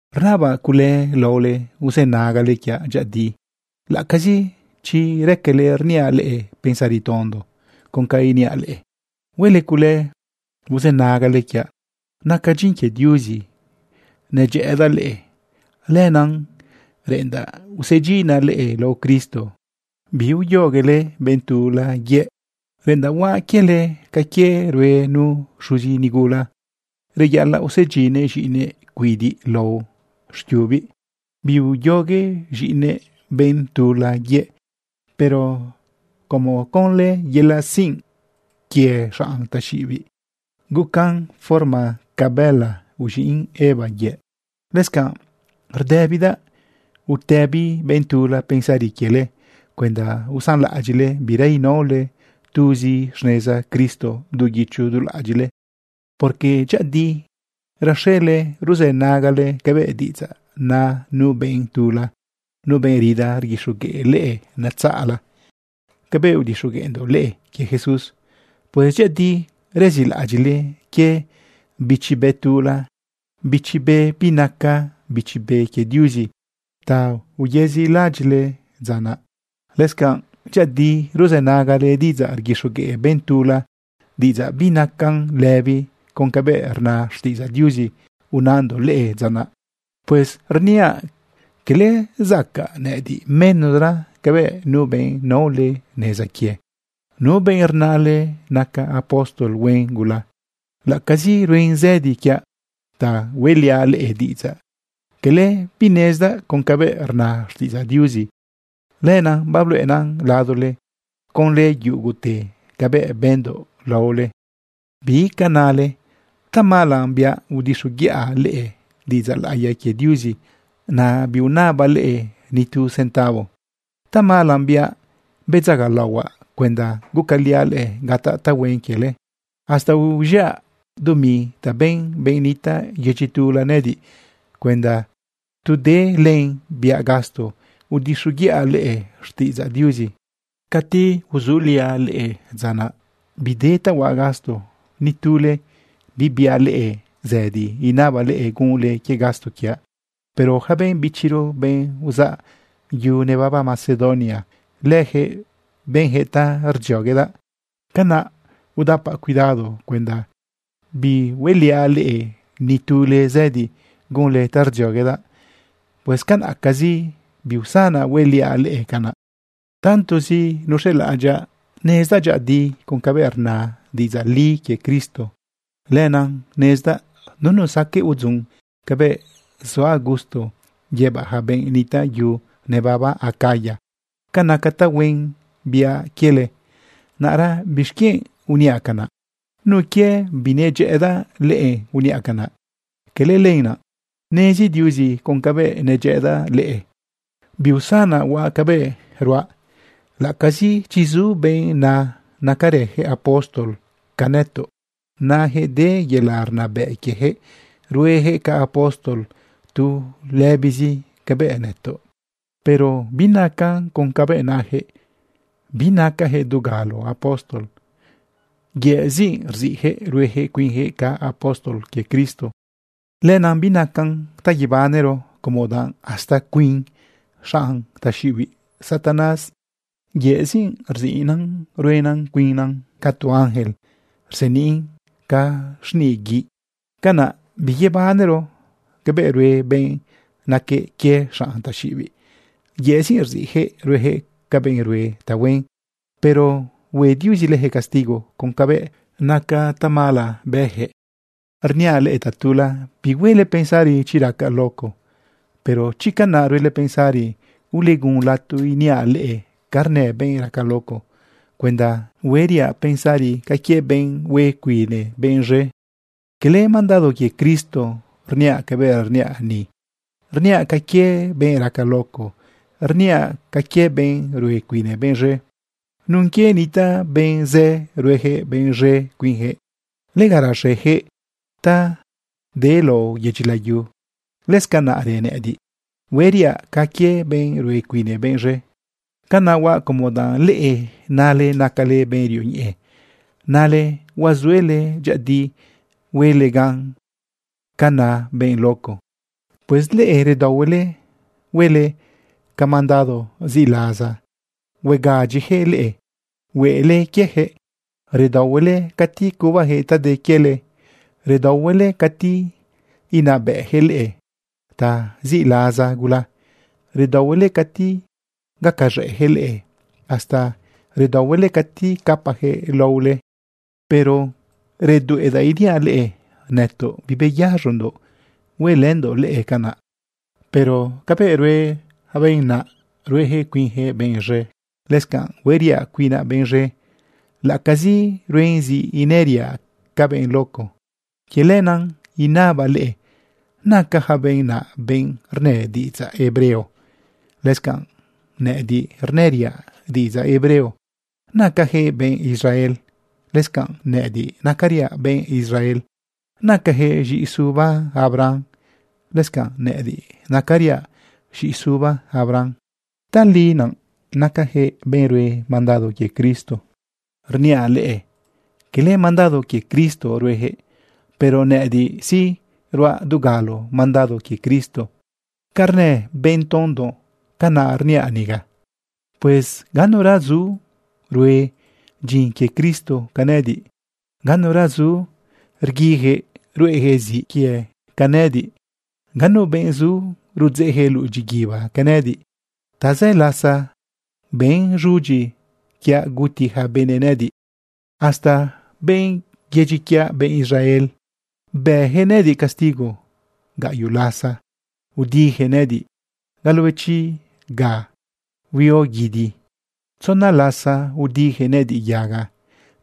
Rnabaꞌ cule laole uzënagale quiaꞌ dyëꞌëdi laꞌacazi chi raquele rniaꞌ leꞌe pensari tondo. Con ca iniaꞌ leꞌe, huele cule uzënagale quiaꞌ. Naca dyin quie Diuzi nedyëꞌëdaꞌ leꞌe, lenaꞌ reꞌendaꞌ usedyinaꞌ leꞌe lao Cristo biuyoguele benꞌ tula yëꞌ. Reꞌendaꞌ huaꞌ quiele ca quie rue nu xuzi nigula. Reyaꞌalaꞌ usedyinnëꞌ z̃iꞌinëꞌ cuidiꞌ lao xquiubiꞌ biuyogue z̃iꞌinëꞌ benꞌ tula yëꞌ. Pero como conlë yelaꞌ sinꞌ quie xanꞌ taxiꞌibiꞌ guquen forma ca bëla uz̃iꞌn Eva yëꞌ, lëscanꞌ rdëbidaꞌ utëbi benꞌ tula pensari quiele cuenda usanlaꞌadyiꞌle bira inaole tuzi xneza Cristo du guicho du laꞌadyiꞌle. Porque dyëꞌëdi raxele ruzënagale cabëꞌ diꞌidzaꞌ na nu benꞌ tula, nu benꞌ rida rguixogueꞌ leꞌe netzaꞌla cabëꞌ udixogueꞌndoꞌ leꞌe quie Jesús. Pues dyëꞌëdi rezilaꞌadyiꞌle quie bichi be tula, bichi be binaca Bichi Be quie Diuzi ta uyezilaꞌadyiꞌle dza naꞌ. Lëscanꞌ dyëꞌëdi ruzënagale diꞌidzaꞌ rguixogueꞌ benꞌ tula, diꞌidzaꞌ binacan lëbi con cabëꞌ rna xtiꞌidzaꞌ Diuzi unandoꞌ leꞌe dza naꞌ. Pues rniaꞌ cala zacaꞌ nëꞌëdiꞌ menosra cabëꞌ nu benꞌ naole neza quie, nu benꞌ rnale naca apóstol huen gula. Laꞌacazi ruen zëdi quiaꞌ ta hueꞌliaꞌ leꞌe diꞌidzaꞌ, cala binezdaꞌ con cabëꞌ rna xtiꞌidzaꞌ Diuzi. Lenaꞌ babluꞌendoꞌ ladole conlë yugute cabëꞌ bëndoꞌ laole. ¿Bi ca nale? ¿Tamala biaꞌ udixoguiꞌa leꞌe diꞌidzaꞌ laꞌiya quie Diuzi, naꞌ biunabaꞌ leꞌe ni tu centavo? ¿Tamala biaꞌ, bedzagalaohuaꞌ cuenda gacaliaꞌ leꞌe gataꞌ tahuen quiele? Hasta uz̃iꞌa dumi ta ben benꞌ nitaꞌ yedyi tula nëꞌëdiꞌ cuenda tu de len biaꞌ gasto udixoguiꞌa leꞌe xtiꞌidzaꞌ Diuzi. Catu uzuliaꞌ leꞌe dza naꞌ, bide ta huaꞌ gasto, ni tule bibiaꞌ leꞌe zëdi inabaꞌle gunle quie gasto quiaꞌ. Pero ja benꞌ bichiro, benꞌ uzaꞌ yu nebaba Macedonia, lëjëꞌ benjëꞌ ta rdzioguedaꞌ. Canaꞌ udapaꞌ cuidado cuenda bihueliaꞌ ni tule zëdi gunle ta rdzioguedaꞌ. Pues canaꞌcazi biusanaꞌ hueliaꞌ leꞌe canaꞌ. Tantozi nuz̃elaꞌadyaꞌ nezdaꞌ dyëꞌëdi con cabëꞌ rna diꞌidzaꞌ li quie Cristo, lenaꞌ nezdaꞌ nunu saqueꞌ udzun cabëꞌ zuaꞌ gusto yëbaꞌ ja benꞌ nitaꞌ yu nebaba Acaya ca naca tahuen biaꞌ quiele. Naꞌra ¿bixquienꞌ uniaꞌ canaꞌ? ¿Nun quie binedyëꞌëdaꞌ leꞌe uniaꞌ canaꞌ? Cala lenaꞌ. Nezi Diuzi con cabëꞌ nedyëꞌëdaꞌ leꞌe. Biusanaꞌ huaꞌ cabëꞌ ruaꞌ laꞌacazi chi zu benꞌ na nacarëjëꞌ apóstol ca nëtoꞌ. Najëꞌ de yelaꞌ rnabëꞌ quiejëꞌ ruejëꞌ ca apóstol tu lëbizi cabëꞌ nëtoꞌ. Pero binacan con cabëꞌ najëꞌ. Binacajëꞌ dugalo apóstol. Yëꞌzi rziꞌjëꞌ ruejëꞌ cuinjëꞌ ca apóstol quie Cristo. Lenaꞌ binacan ta yebanero, como danꞌ hasta cuin xanꞌ taxiꞌibiꞌ Satanás yëꞌzi rziꞌnëꞌ ruenëꞌ cuinnëꞌ ca tu ángel rseniꞌn ca xniꞌ guiꞌ. Canaꞌ biyebanero cabëꞌ rue benꞌ naque quie xanꞌtaxiꞌibiꞌ. Yëꞌzi rziꞌjëꞌ ruejëꞌ ca benꞌ rue tahuen. Pero hue Diuzi lëjëꞌ castigo con cabëꞌ naca tamala bëjëꞌ. Rniaꞌ leꞌe tatula: Bihuele pensari chi racaꞌ luco. Pero chi canaꞌ ruele pensari, ulegun lato iniaꞌ leꞌe ca rnë benꞌ raca luco cuenda hueriaꞌ pensari ca quie benꞌ hue cuine benꞌ z̃e. Quele mandado quie Cristo rniaꞌ cabëꞌ rniaꞌ ni. Rniaꞌ ca quie benꞌ raca luco. Rniaꞌ ca quie benꞌ rue cuine benꞌ z̃e. Nun quie nitaꞌ benꞌ zë ruejëꞌ benꞌ z̃e cuinjëꞌ, lega raxejëꞌ ta de lao yedyi layu, lëscanaꞌrë nëꞌëdiꞌ, hueriaꞌ ca quie benꞌ rue cuine benꞌ z̃e. Canaꞌ huaꞌ como danꞌ leꞌe nale nacale benꞌ rioñeꞌe, nale huazuele dyëꞌëdi huele gan ca na benꞌ luco. Pues leꞌe redaohuele huele ca mandado ziꞌlaza huegadyijëꞌ leꞌe huele quiejëꞌ. Redaohuele cati cubajëꞌ ta de quiele, redaohuele cati inabëꞌjëꞌ leꞌe ta ziꞌlaza gula, redaohuele cati gacaz̃ëꞌjëꞌ leꞌe, hasta redaohuele cati capajëꞌ laohuele. Pero redueꞌdaꞌ iniaꞌ leꞌe nëtoꞌ bibeyaz̃ondoꞌ huelëndoꞌ leꞌe canaꞌ. Pero cabëꞌ rue ja benꞌ naꞌ, ruejëꞌ cuinjëꞌ benꞌ z̃e, lëscanꞌ hueriaꞌ cuinaꞌ benꞌ z̃e laꞌacazi ruen zi inëriaꞌ ca benꞌ luco. Quie lenaꞌ inabaꞌ leꞌe, ¿naca ja benꞌ naꞌ benꞌ rnë diꞌidzaꞌ hebreo? Lëscanꞌ nëꞌëdiꞌ, rnëriaꞌ diꞌidzaꞌ hebreo. ¿Nacajëꞌ benꞌ Israel? Lëscanꞌ nëꞌëdiꞌ, nacariaꞌ benꞌ Israel. ¿Nacajëꞌ z̃iꞌisuba Abraham? Lëscanꞌ nëꞌëdiꞌ, nacariaꞌ z̃iꞌisuba Abraham. ¿Tali naꞌ nacajëꞌ benꞌ rue mandado quie Cristo? Rniaꞌ leꞌe cala mandado quie Cristo ruejëꞌ. Pero nëꞌëdiꞌ sí, ruaꞌ dugalo mandado quie Cristo. Ca rnë benꞌ tondo, canaꞌ rniaꞌ niga. Pues ganura zu rue dyin quie Cristo ca nëꞌëdiꞌ. Ganura zu rguijëꞌ ruꞌejëꞌ ziꞌ quie ca nëꞌëdiꞌ. Ga nu benꞌ zu rudzeꞌjëꞌ luꞌu dyiguiba ca nëꞌëdiꞌ. Tazë lasa bën z̃udyi quiaꞌ guti ja benëꞌ nëꞌëdiꞌ. Hasta benꞌ yedyi quiaꞌ, benꞌ Israel, bëjëꞌ nëꞌëdiꞌ castigo. Gaꞌyoꞌ lasa udijëꞌ nëꞌëdiꞌ galobechi ga huio guidi. Tzona lasa udijëꞌ nëꞌëdiꞌ yaga.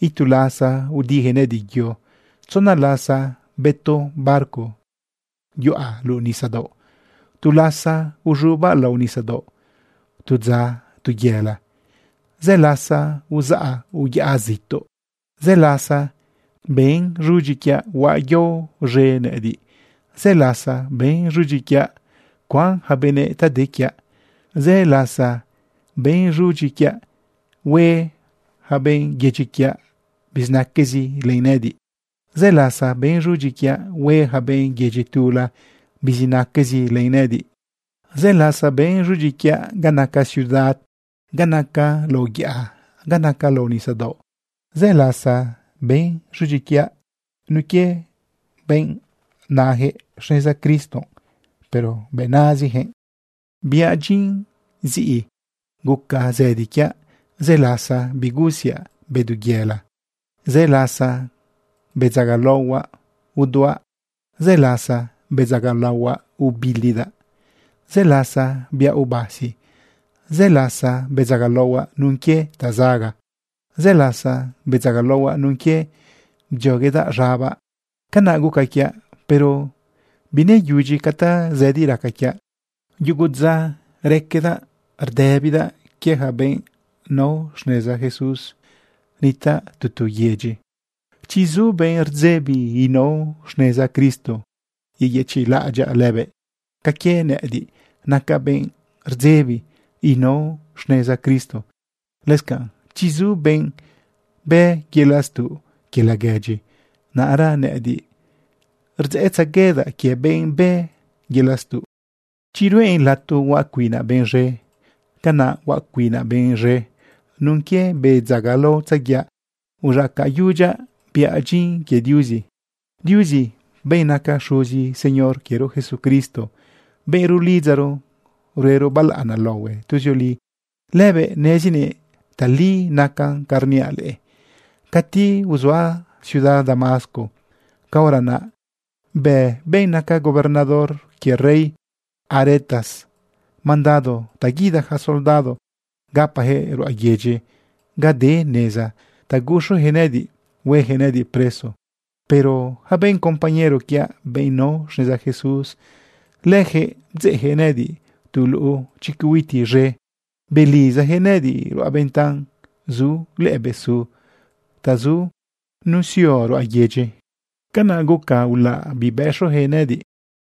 Itu lasa udijëꞌ nëꞌëdiꞌ yo. Tzona lasa betu barco yuꞌa luꞌu nisadaoꞌ. Tu lasa uz̃ubaꞌ lao nisadaoꞌ tu dza tu yela. Zë lasa uzaꞌa uyaꞌa zituꞌ. Zë lasa ben z̃udyi quiaꞌ huaꞌ yao z̃e nëꞌëdiꞌ. Zë lasa ben z̃udyi quiaꞌ cuan ja benëꞌ ta de quiaꞌ. Zë lasa ben z̃udyi quiaꞌ hue ja benꞌ yedyi quiaꞌ bizinaquezi len nëꞌëdiꞌ. Zë lasa ben z̃udyi quiaꞌ hue ja benꞌ yedyi tula bizinaquezi len nëꞌëdiꞌ. Zë lasa ben z̃udyi quiaꞌ ga naca ciudad, ga naca lao yaꞌa, ga naca lao nisadaoꞌ. Zë lasa ben z̃udyi quiaꞌ nun quie benꞌ na najëꞌ xneza Cristo, pero bëꞌ nazijëꞌ. Biaꞌ dyin ziꞌi guca zëdi quiaꞌ. Zë lasa bigusiaꞌ bedu yela. Zë lasa bedzagalaohuaꞌ uduaꞌ. Zë lasa bedzagalaohuaꞌ ubilidaꞌ. Zë lasa biaꞌ ubasi. Zë lasa bedzagalaohuaꞌ nun quie tazaga. Zë lasa bedzagalaohuaꞌ nun quie bdzioguedaꞌ z̃abaꞌ. Canaꞌ guca quiaꞌ, pero bineyudyi ca tazëdi raca quiaꞌ. Yugu dza raquedaꞌ rdëbidaꞌ quie ja benꞌ nao xneza Jesús nitaꞌ tu tu yedyi. Chi zu benꞌ rdzebi inao xneza Cristo, yeyëchiꞌlaꞌadyaꞌ lëbëꞌ ca quie nëꞌëdiꞌ nacaꞌ benꞌ rdzebi inao xneza Cristo. Lëscanꞌ chi zu benꞌ bë yelaꞌ stuꞌ quie laguedyi, naꞌra nëꞌëdiꞌ rdzeꞌtzeguedaꞌ quie benꞌ bë yelaꞌ stuꞌ. Chi ruꞌen lato huaꞌ cuinaꞌ benꞌ z̃e, canaꞌ huaꞌ cuinaꞌ benꞌ z̃e nun quie bedzagalaotzaguiaꞌ uz̃acayudyaꞌ biaꞌ dyin quie Diuzi. Diuzi, benꞌ naca Xuzi Señor quiero Jesucristo, benꞌ rulidzaro ruero balaꞌana laohue tuzioli, lëbëꞌ nezinëꞌ tali nacan ca rniaꞌ leꞌe. Cati uzuaꞌ ciudad Damasco, caora naꞌ bë benꞌ naca gobernador quie rey Aretas mandado ta guida ja soldado gapajëꞌ ruꞌa yedyi ga de neza ta guxujëꞌ nëꞌëdiꞌ huejëꞌ nëꞌëdiꞌ preso. Pero ja benꞌ compañero quiaꞌ, benꞌ nao xneza Jesús, lëjëꞌ bdzeꞌjëꞌ nëꞌëdiꞌ tu luꞌu chicuiti z̃e, belizajëꞌ nëꞌëdiꞌ ruꞌa ventan zu lëꞌë besu ta zu nusio ruꞌa yedyi. Canaꞌ guca ulaꞌ bibëxujëꞌ nëꞌëdiꞌ.